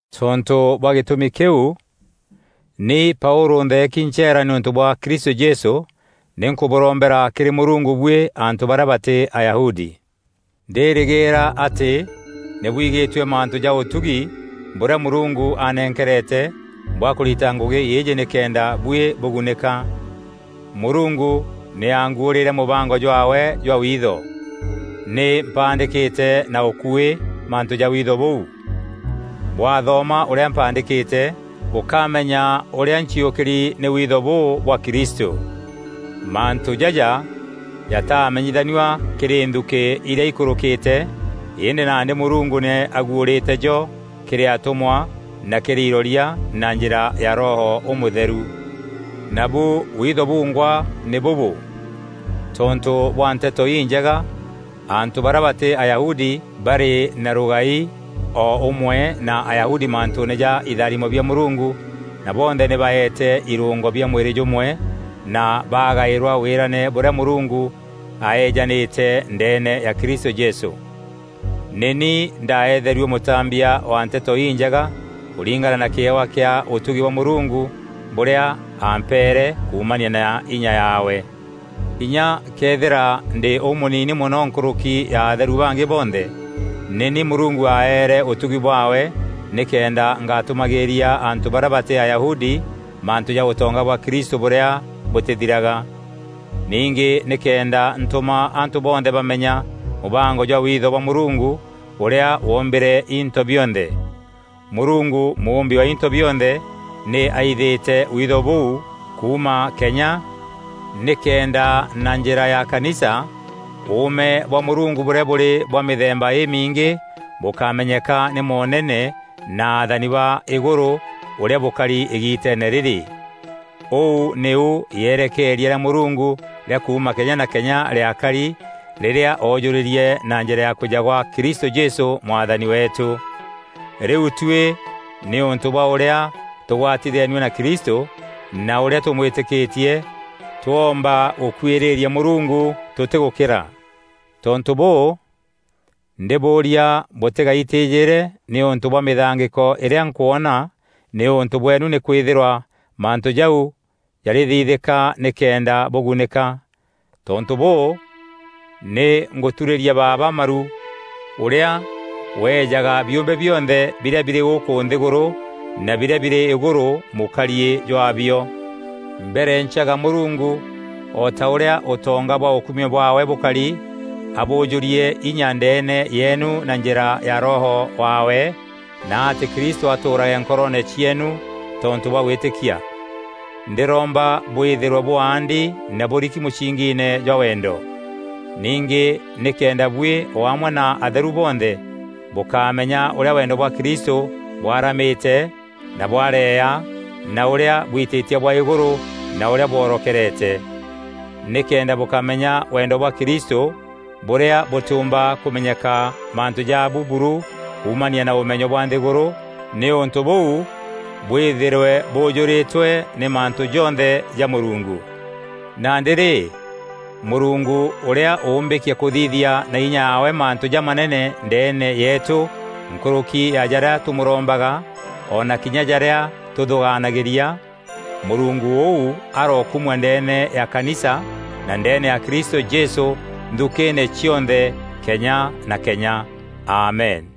Tontû bwa gîtûmi kîu, ni Paûlû ntheeki ncheera nîûntû bwa Kristû Jesû, nî nkûbûrombera kîrî Mûrungu buî antû barîa batî Ayahudi. Ndîrîgîîra atî nî bwigîtue mantû ja ûtugi bûrîa Mûrungu anenkerete bwa kûrita ngûgî îîjî nîkenda buî bûgunîka. Mûrungu nî angwuûrîre mûbango jwaawe jwa witho. Nî mpaandîkîte na ûkuî mantû ja witho bûu. Bwaathoma ûrîa mpaandîkîte, bûkamenya ûrîa nciûkîri nî witho bûû bwa Kristû. Mantû jaja jataamenyithanua kîrî nthukî irîa ikûrûkîte îndî nandî Mûrungu nî aguûrîte jo kîrî atûmwa na kîrî iroria na njîra ya Roho Ûmûtheru. Nabu witho bungwa nî bûbû: tontû bwa Nteto Injega, antû barîa batî Ayahudi barî na rûgai o ûmwe na Ayahudi mantûûne ja itharimo bia Mûrungu na bonthe nî baete irûngo bia mwîrî jûmwe na baagaîrwa wîrane bûrîa Mûrungu aejanîte ndeene ya Kristû Jesû. Nî ni ndaetherue mûtambia wa Nteto Injega kûringana na kîewa kîa ûtugi bwa Mûrungu bûrîa ampeere kuumania na inya yaawe. Kinya këethîra ndî ûmûnini mono nkûrûki ya atheru bangî bonthe, nî ni Mûrungu aeere ûtugi bwaawe nîkenda ngatûmagîîria antû barîa batî Ayahudi mantû ja ûtonga bwa Kristû bûrîa bûtîthiraga. Ningî nîkenda ntûma antû bonthe bamenya mûbango jwa witho bwa Mûrungu ûrîa wombîre into bionthe. Mûrungu mûûmbi wa into bionthe, nî aithîte witho bûu kuuma kenya, nîkenda na njîra ya kanisa ûûme bwa Mûrungu bûrîa bûrî bwa mîthemba îmiingî bûkamenyeka nî moonene na athani ba îgûrû ûrîa bûkari îgiiteene rîrî. Ûu nîu yerekeeria rîa Mûrungu rîa kuuma kenya na kenya rîakari rîrîa oojûrîrie na njîra ya kwîja gwa Kristû Jesû Mwathani weetû. Rîu tuî nîûntû bwa ûrîa tûgwatithenue na Kristû na ûrîa tûmwîtîkîtie, twoomba gûkwîîrîria Mûrungu tûtîgûkîra. Tontû bûû, ndîbûûria bûtîgaîtîjîre nîûntû bwa mîthangîko îrîa nkwona nîûntû bweenu nîkwîthîrwa mantû jau jarîthithîka nîkenda bûgunîka. Tontû bûû, nî ngûturîria Baaba maru, ûrîa weejaga biûmbe bionthe birîa birî gûkû nthîgûrû na birîa birî îgûrû mûkariî jwaabio. Mberencaga Mûrungu, o ta ûrîa ûtonga bwa ûkumio bwaawe bûkari, abûûjûrie inya ndeene yeenu na njîra ya Roho waawe, na atî Kristû atûûrage nkoroone cieenu tontû bwa gwîtîkia. Ndîromba bwîthîrwe bûaandi na bûriki mûsingiine jwa wendo. Ningî nîkenda buî o amwe na atheru bonthe bûkamenya ûrîa wendo bwa Kristû bwaramîte na bwareea na ûrîa bwitîtie bwa îgûrû na ûrîa bworokerete. Nîkenda bûkamenya wendo bwa Kristû bûrîa bûtîûmba kûmenyeka mantû jaabu buru kuuumania na ûmenyo bwa nthîgûrû nîûntû bûu bwîthîrwe bûûjûrîtwe nî mantû jonthe ja Mûrungu. Nandî rî, Mûrungu ûrîa ûûmbîkia kûthithia na inya yaawe mantû jamanene ndeene yeetû nkûrûki ya jarîa tûmûrombaga, o na kinya jarîa tûthûgaanagîria, Mûrungu ûu arokumua ndeene ya kanisa na ndeene ya Kristû Jesû nthukîîne cionthe kenya na kenya. Amen.